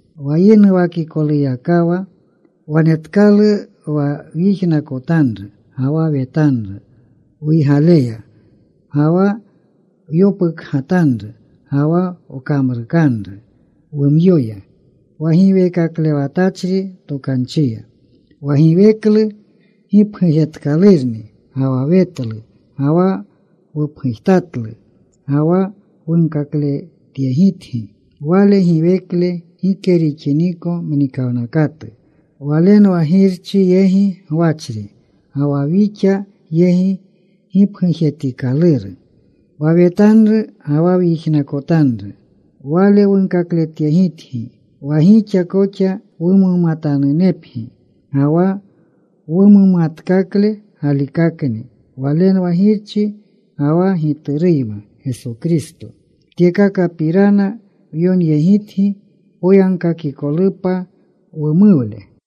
Wa yinuwakikoluyakawa wanetkalu wa wyijnakotanru ga wa wetanru wuygaleya, ga wa wyopukgatanru, ga wa wkamrukanru wumyoya wa giweekaklewatachri tokanchiya. Wa giweklu gipgujetkalurni ga wa wetlu. Ga wa wupgujtatlu ga wa wunkakletyegitgi Wale giweklu gike rixiniko mnikawnakatu. Walenwa Girchi yegi gwachri, ga wa wixa yegi gipgujetikaluru. Wa wetanru ga wa wyijnakotanru, Wale wunkakletyegitgi wa gixa koxa wumumatanunepgi, ga wa wumumatkakle galikakni walenwa Girchi ga wa Gituruyma Geso Kristo. Tyekakapirana wyonyegitgi poyagkakikolupa wumuwle.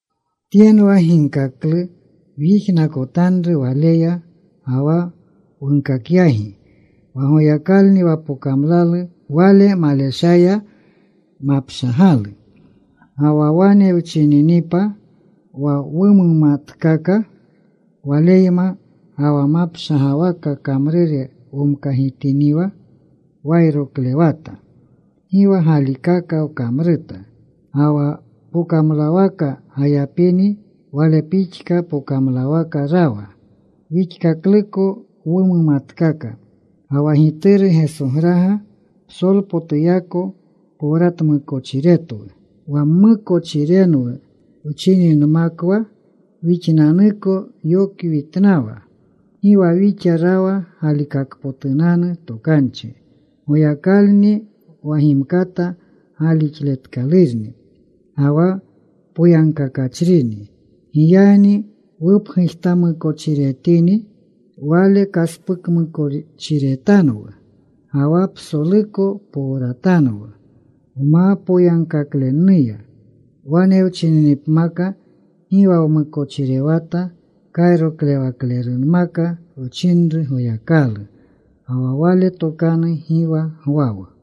Tyenwa ginkaklu wyijnakotanru Waleya, ga wa wunkakyagi, wa Goyakalni wa pokamlalu. Wale maleshaya mapshagalu. Ga wa wane wchininipa wa wumumatkaka Waleyma ga wa mapshagawaka kamrure womkagitiniwa, wayroklewata. Gi wa galikaka wkamruta. Ga wa pokamlawaka gayapini Wale pixka pokamlawaka rawa, wixkakluko wumumatkaka. Ga wa Gituru Gesograga psolpotuyako powratmukochiretwu. Wa mmukochirenwu wchininmakwa wixnanniko wyokwitnanwa. Gi wa wixa rawa galikakpotunanu tokanchi. Goyakalni wa gimkata galixletkalurni ga wa poyagkakachrini. Giyagni wupgujtamukochiretini, Wale kaspukmukochiretanwu ga wa psoluko powratanwu wma poyagkaklenuya. Wane wchininipmaka gi wa wmukochirewata, kayroklewaklermaka wchinru Goyakalu ga wa Wale tokanu gi wa gwawu.